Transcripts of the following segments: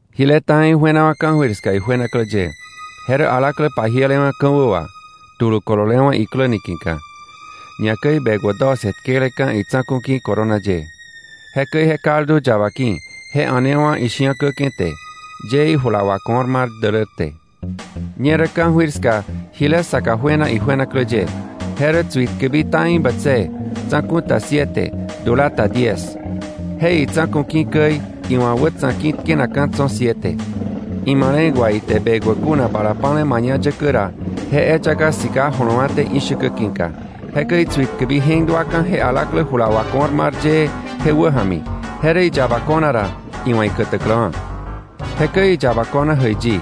Jile ta̱i juenawa̱ ka̱jöir ska ijuenaklä ye: Je rä alaklä pajielewa̱ ka̱wä wà, tulu kololewa̱ iklä niki̱ka, ñakäi bekwä doce tkeleka̱ itsa̱ku̱ ki̱ corona ye. Jekäi je kaldu yaba ki̱, je a̱newa̱ ishi̱akäke̱ te, yee ijula wako̱r mar dälär te. Ñerä ka̱jöir ska jile saka juena ijuenaklä ye, je rä tsuitkäbi ta̱i bätsëë, tsa̱ku̱ ta siete, dula ta diez, je itsa̱ku̱ käi iwa̱ wätsa̱ ki̱ tkenakka̱ tso̱ siete. Imale̱k wa ite bekwä kuna bala pa̱le mañayäkä ra je eyaka sika jolowa̱té ishäkä ki̱ka. Jekäi tsuitkäbi je̱k duaka̱ je alaklä jula wako̱r mar yee je wäja̱mi, je rä iyaba ko̱na ra iwa̱ ikätäkläwa̱. Jekäi iyaba ko̱na jäiyi,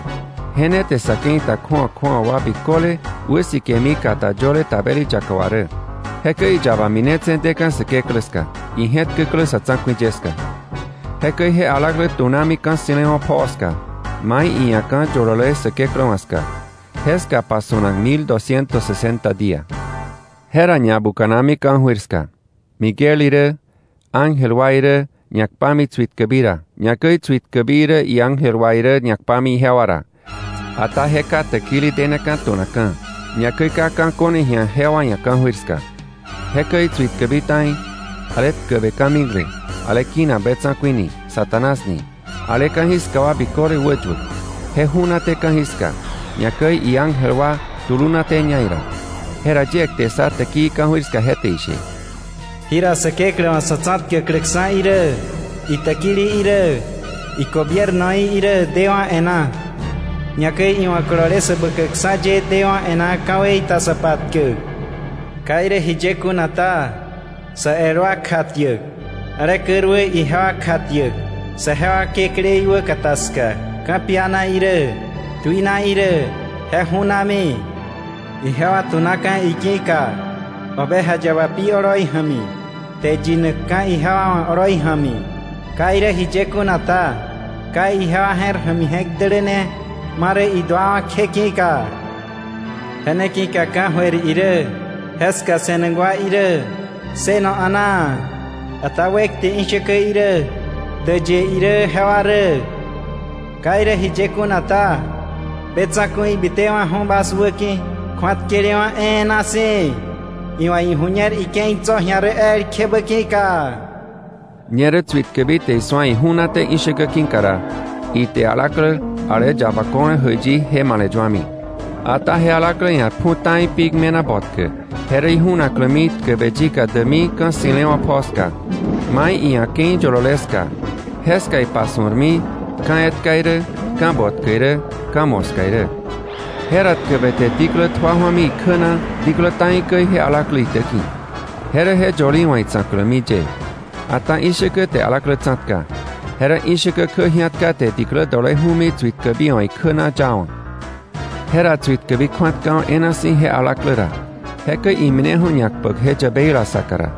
je ne te sa̱ ke̱i ta kju̱awa kju̱awa wa biköle wäsikemi kata yöle tabeli yaka wà rä. Jekäi iyaba minetse̱ deka̱ Säkeklä ska, ije̱tkäklä sa̱ tsa̱ku̱i ye ska. Jekäi je alaklä tu̱nami ka̱ ssi̱lewa̱ pjoo ska, mai iia̱ ka̱ yolole Säkeklä wa̱ ska, jeska pasu̱nak mil dosciento sesenta día. Jera ñabuka̱nami ka̱jöir ska. Miguel irä, iángel wa irä ñakpami tsuitkäbi ra, ñakäi tsuitkäbi irä iángel wa irä ñakpami ijewa ra, ata je ka täkili deneka̱ tu̱nakka̱, ñakäi ka ka̱ ko̱ne ji̱a jewa ia̱ ka̱jöir ska. Jekäi tsuitkäbi ta̱i, ale tkäbe ka̱mikle, ale kinak be tsa̱ku̱i ni, Satanás ni, ale ka̱jiska wa biköle wäyuäk, je ju̱naté ka̱jiska, ñakäi iángel wa tulunatéña ira. Jera yie kte ssa täkii ka̱jöir ska, je te ishe: “Jira Säkeklä wa̱ sa̱ tsa̱tkäkläkksa̱ irä, itäkili irä, igobiernoí irä dewa̱ e̱ná, ñakäi iwa̱ kolole Säbäkäkksa̱ ye dewa̱ e̱ná ka̱wei ta sa patkäk. Ka irä jiye kuna ta, sa el wa kjatiäk, ale käruä ijewa kjatiäk saje wa Kekläí wäkata ska ka̱piana irä tuina irä, je ju̱nami. Ije wa tu̱naka̱ iki̱ka, Oveja Yaba pi irä, kte yinakka̱ ijewa wa̱ irä oloi ja̱mi. Ka irä jiye kuna ta, ka ijewa je̱r ja̱mi je̱k däläne ma rä iduawa̱ kje ki̱ka. ¡Je ne ki̱ka ka̱jöir irä jeska se̱nak wa irä ssëno a̱naa! ¡Ata wekte ishäkä irä, däyë irä jewa rä! Ka irä jiye kuna ta, be tsa̱ku̱i bitewa̱ju̱ bas wäki̱, kju̱atkelewa̱ e̱e̱na si̱, iwa̱ iju̱ñer ike̱i tso̱ ji̱a rä elkjebä ki̱ka.” Ñerä tsuitkäbi te isu̱a iju̱naté ishäkä ki̱ka ra, ite alaklä ale yaba ko̱le jäiyi je male̱yuami. Ata je alaklä ia̱ pju̱ ta̱i pik me̱na botkä, je rä iju̱naklämi tkäbe yika däkmi ka̱ ssi̱lewa̱ pjoo ska, mai iia̱ ike̱i yolole ska, jeska ipasu̱rmi ka̱ etka irä, ka̱ botkä irä, ka̱ moska irä. Jera tkäbe te diklä tjua jua̱mi ikjä na diklä ta̱i käi je alaklä itäki̱, je rä je yölí wa̱ itsa̱klämi ye. Ata ishäkä te alaklä tsa̱tka. Je rä ishäkä kjä ji̱atka te diklä dole ju̱mi tsuitkäbi wa̱ ikjä na yawa̱. Jera tsuitkäbi kju̱atkawa̱ e̱e̱na si̱ je alaklä ra, jekäi imineju̱ ñakpäk je yäbeila saka ra.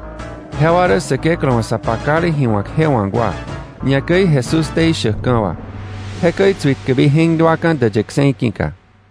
Jewa rä Säkeklä wa̱ sa pakale ji wa̱k je wawa̱k wa, ñakäi Jesús ktei shäkka̱ wa. Jekäi tsuitkäbi je̱k duaka̱ däyë kse̱i ki̱ka.